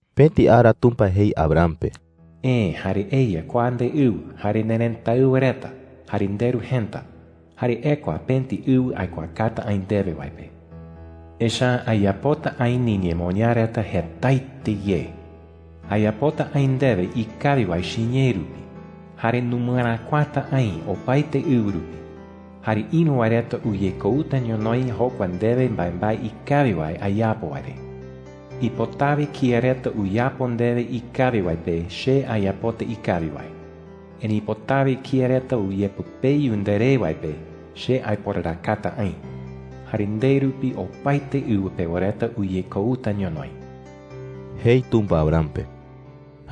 Pëti ara Tumpa jei Abram pe: “Eë jare eya kua ndeɨwɨ jare nerëtáɨwa reta jare nderu jëta, jare ekua pëti ɨwɨ aikuaakata aï ndewe wae pe. Echa’ä ayapota aï niñemoñaa reta jetaete ye,” jei. “Ayapota aï ndewe ikawi wae chiñee rupi jare numɨeräkuakata aï opaete ɨwɨ rupi. Jare ïru wae reta uyekouta ñonoï jokua ndewe mbaembae ikawi wae ayapo wae re. Ipotawe kía reta uyapo ndewe ikawi wae pe che ayapota ikawi wae. Erëi ipotawe kía reta uyepɨpeyu nderé wae pe che aiporarakata aï. Jare nde rupi opaete ɨwɨ pewa reta uyekouta ñonoï,” jei Tumpa Abram pe.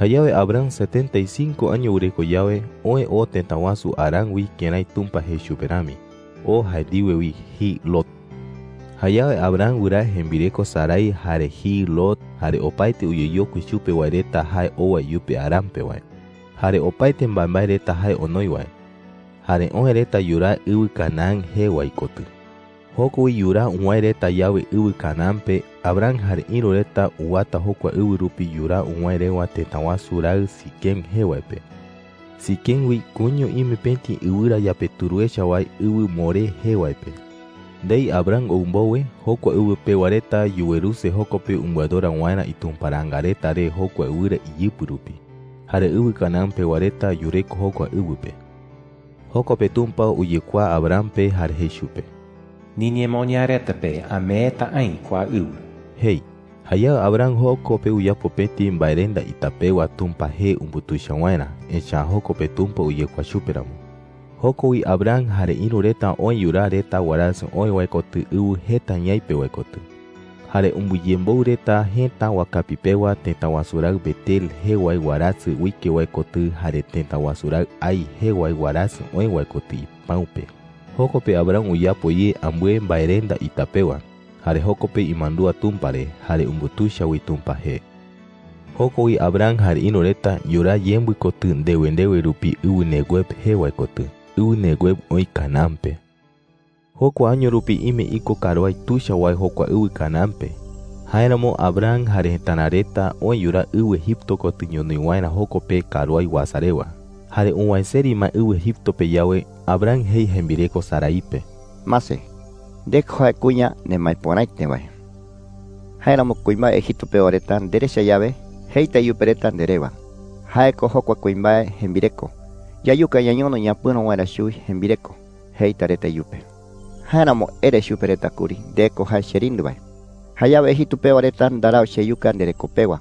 Jayawe Abram setenta y cinco año wɨreko yawe, oë oo tëta wasu Harán wi kërái Tumpa jei chupe rami. Oo jae ndiwe wi jiɨ Lot. Jayawe Abram wɨraa jembireko Sarai, jare jiɨ Lot, jare opaete uyeyokui chupe wae reta jae owa iyupe Harán pe wae, jare opaete mbaembae reta jae onoi wae. Jare oë reta yuraa ɨwɨ Canaán jee wae kotɨ. Joko wi yuraa uwäe reta yawe ɨwɨ Canaán pe, Abram jare ïru reta uwata jokua ɨwɨ rupi yuraa uwäe rewa tëta wasu raɨ Siquem jee wae pe. Siquem wi koiño ime pëti ɨwɨrayapeturu echa wae, ɨwɨ Moré jee wae pe. Ndei Abram ou mbowe, jokua ɨwɨ pewa reta yuweruse joko pe umbɨadora waerä itumparaanga reta re jokua ɨwɨra iyɨpɨ rupi. Jare ɨwɨ Canaán pewa reta yureko jokua ɨwɨ pe. Joko pe Tumpa uyekuaa Abram pe jare jei chupe: “Niñemoñaa reta pe ameeta aï kua ɨwɨ,” jei. Jayawe Abram joko pe uyapo pëti mbaerenda ita pewa Tumpa jee umbutuicha waerä, echa’ä joko pe Tumpa uyekuaa chupe ramo. Joko wi Abram jare ïru reta oë yuraa reta warasɨ oë wae kotɨ ɨwɨ jeta ñaipe wae kotɨ. Jare umbɨyemboɨ reta jëta wakapi pewa tëta wasu raɨ Betel jee wae warasɨ uike wae kotɨ jare tëta wasu raɨ Hai jee wae warasɨ oë wae kotɨ ipäu pe. Joko pe Abram uyapo ye ambɨe mbaerenda ita pewa. Jare joko pe imandúa Tumpa re, jare umbutuicha wi Tumpa jee. Joko wi Abram jare ïru reta yuraa yembɨ kotɨ ndewe ndewe rupi ɨwɨ Neguev jee wae kotɨ. Ɨwɨ Neguev oï Canaán pe. Jokua año rupi ime iko karuái tuicha wae jokua ɨwɨ Canaán pe. Jáeramo Abram jare jëtara reta oë yuraa ɨwɨ Egipto kotɨ ñonoï waerä joko pe karuái uasa rewa. Jare uwäe seri ma ɨwɨ Egipto pe yawe, Abram jei jembireko Sarai pe: “Mase, nde ko jae kuña nemaepöraete wae,” jei. “Jáeramo kuimbae Egipto pewa reta nderecha yawe, jeita iyupe reta nde rewa: ‘Jae ko jokua kuimbae jembireko. Yayuka ñañono ñapɨ̈ro waerä chuwi jembireko,’ jeita reta iyupe,” jei. “Jáeramo ere chupe reta kuri nde ko jae cherindɨ wae. Jayawe Egipto pewa reta ndarau cheyuka ndereko pewa,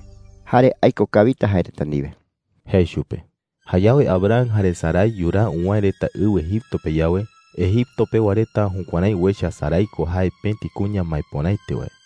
jare aiko kawita jae reta ndiwe,” jei chupe. Jayawe Abram jare Sarai yuraa uwäe reta ɨwɨ Egipto pe yawe, Egipto pewa reta jukuärái uecha Sarai ko jae pëti kuña maepöraete wae.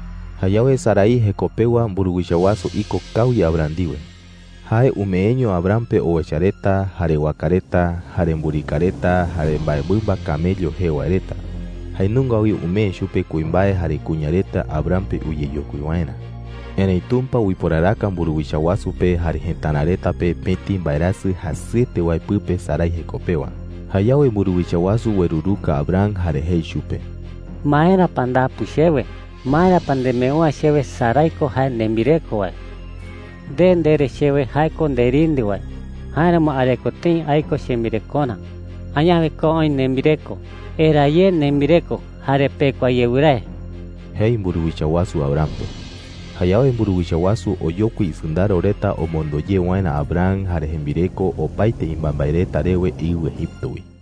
Jayawe Sarai jeko pewa mburuwicha wasu iko kawi Abram ndiwe. Jae umeeño Abram pe owecha reta, jare waka reta, jare mburika reta, jare mbaemɨmba camello jee wae reta. Jae nunga wi umee chupe kuimbae jare kuña reta Abram pe uyeyokui waerä. Erëi Tumpa uiporaraka mburuwicha wasu pe jare jëtara reta pe pëti mbaerasɨ jasɨete wae pɨpe Sarai jeko pewa. Jayawe mburuwicha wasu ueruruka Abram jare jei chupe: “¿Maera pa ndapu chewe? ¿Maera pa nembeu’ä chewe Sarai ko jae nembireko wae?” jei chupe. “Nde ndere chewe jae ko nderindɨ wae; jáeramo areko tëi aiko chembirekorä. ¡Añawe ko oï nembireko! ¡Eraa ye nembireko jare pekua ye wɨrae!” jei mburuwicha wasu Abram pe. Jayawe mburuwicha wasu oyokui isɨndaro reta omondo ye waerä Abram jare jembireko opaete imbaembae reta rewe ɨwɨ Egipto wi.